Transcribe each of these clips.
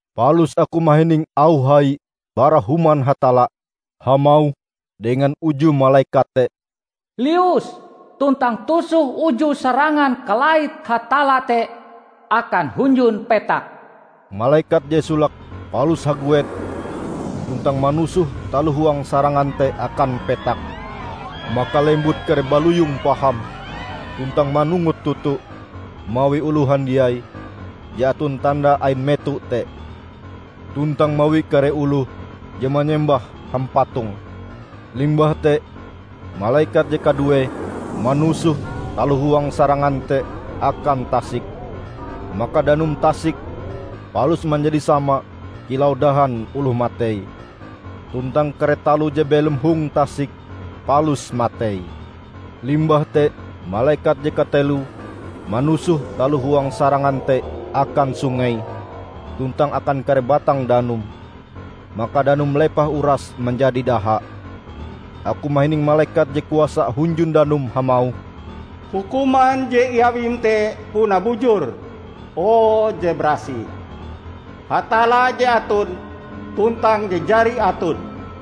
Palus aku mahining auh hai bara Human Hatalla hamauh dengan uju malekat te, "Lius tuntang tusoh uju sarangan kalait Hatalla te akan hunjun petak!" Malekat je solake palus haguet tuntang manusoh taloh huang sarangan te akan petak. Maka lembut kare baloyong paham tuntang manungut toto mawi oloh handiai je aton tanda ain meto te, tuntang mawi kare oloh je manyembah hampatonge. Limbah te malekat je kaduee manusoh taloh huang sarangan te akan tasik. Maka danum tasik palus manjadi sama kilau dahan oloh matei, tuntang kare taloh je belom hong tasik palus matei. Limbah te malekat je kateloe manusoh taloh huang sarangan te akan sungei tuntang akan kare batang danum, maka danume lepah uras manjadi daha. Aku mahining malekat je kuasa hunjun danum hamauh, "Hukuman je iawim te puna bujur, o Je Barasih, Hatalla je aton, tuntang je jari aton!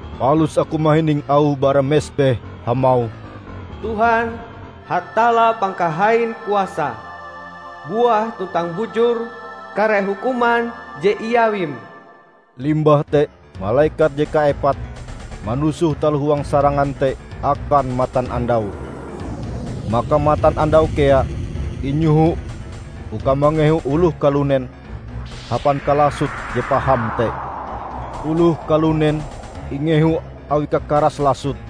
Palus aku mahining auh bara mesbeh hamauh, "Tuhan, Hatalla Pangkahain Kuasae, buah tuntang bujur kare hukuman je iawim!" Limbah te malekat je kaepat manusoh taloh huang sarangan te akan matanandau, maka matanandau kea inyoho uka mangehu oloh kalunen hapan kalasote je paham te. Oloh kalunen ingehu awi kakaras lasote,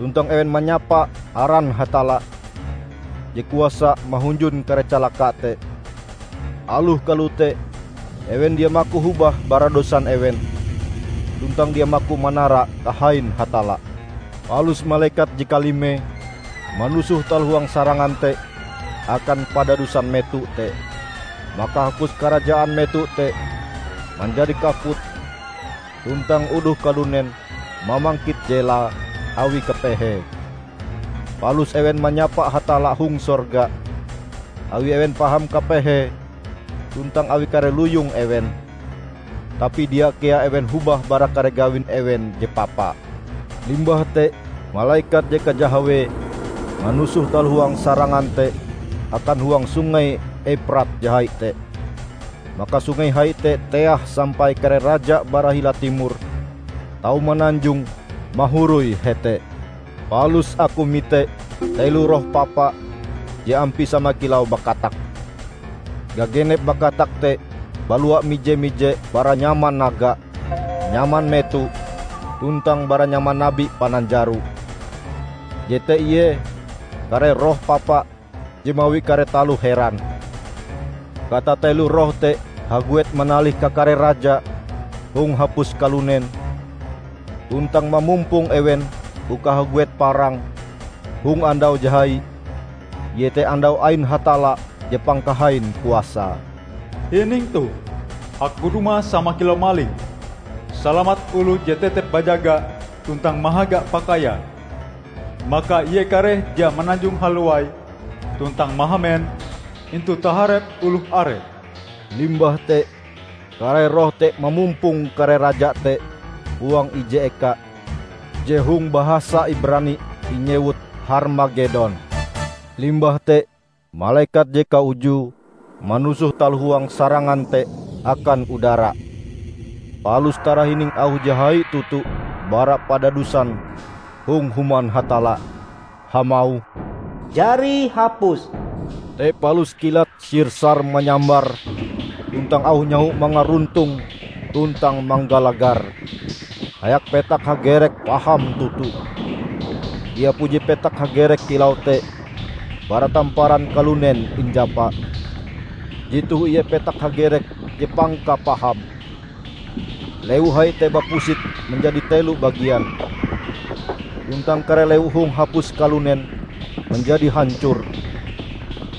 tuntang ewen manyapa aran Hatalla, je kuasa mahunjun kare calaka te. Aloh kalote, ewen dia maku hobah bara dosan ewen tuntang dia maku manara kahain Hatalla. Palus malekat je kalimee manusoh taloh huang sarangan te akan padadusan meto te. Maka hapus karajaan meto te manjadi kaput tuntang oloh kalunen mamangkit jelae awi kapehee. Palus ewen manyapa Hatalla hong sorga awi ewen paham kapehe tuntang awi kare luyong ewen. Tapi dia kea ewen hobah bara kare gawin ewen je papa. Limbah te malekat je kajahawee manusoh taloh huang sarangan te akan huang Sungei Euprat je hai te. Maka sungei hai te teah sampai kare raja bara hila timor tau mananjong mahoroi hete. Palus aku mite telo roh papa je ampie sama kilau bakatak. Gagenep bakatak te balua mije-mije bara nyaman naga, nyaman meto, tuntang bara nyaman nabi pananjaro. Jete ie kare roh papa je mawi kare taloh heran. Katatelo roh te haguet manalih kakare raja hong hapus kalunen tuntang mamumpong ewen uka haguet parang hong andau je hai, iete andau ain Hatalla je Pangkahain Kuasae. "Hining toh! Aku dumah sama kilau maling! Salamat oloh je tetep bajaga tuntang mahaga pakaiae, maka ie kareh dia mananjong halowai tuntang mahamen intu taharep oloh are!" Limbah te kare roh te mamumpong kare raja te huang ije eka je hong bahasa Ibrani inyewut Harmagedon. Limbah te malekat je kaujue manusoh taloh huang sarangan te akan udara. Palus tarahining auh je hai toto bara padadusan hong Human Hatalla, hamauh, "Jari hapus!" Te palus kilat sir-sar manyambar tuntang auh nyaho mangaruntong tuntang manggalagar, hayak petak hagerek paham toto. Dia puji petak hagerek kilau te bara tamparan kalunen injapa. Jetoh ie petak hagerek je pangkapahame! Lewu hai te bapusit manjadi telo bagian, tuntang kare lewu hong hapus kalunen manjadi hancor.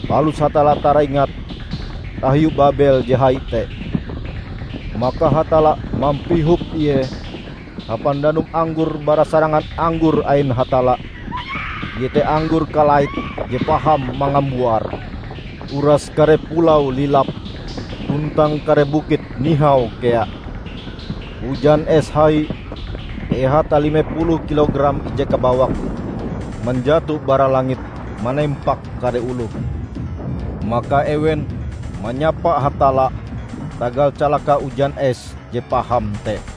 Palus Hatalla taraingat tahiu Babel je hai te. Maka Hatalla mampihop ie hapan danum anggor bara sarangan anggor ain Hatalla -- iete anggor kalait je paham mangambuar. Uras kare pulau lilap, tuntang kare bukit nihau kea. Ujan es hai, ehate lime puluh kilogram ije kabawak, manjato bara langit manempak kare oloh. Maka ewen manyapa Hatalla tagal calaka ujan es je paham te.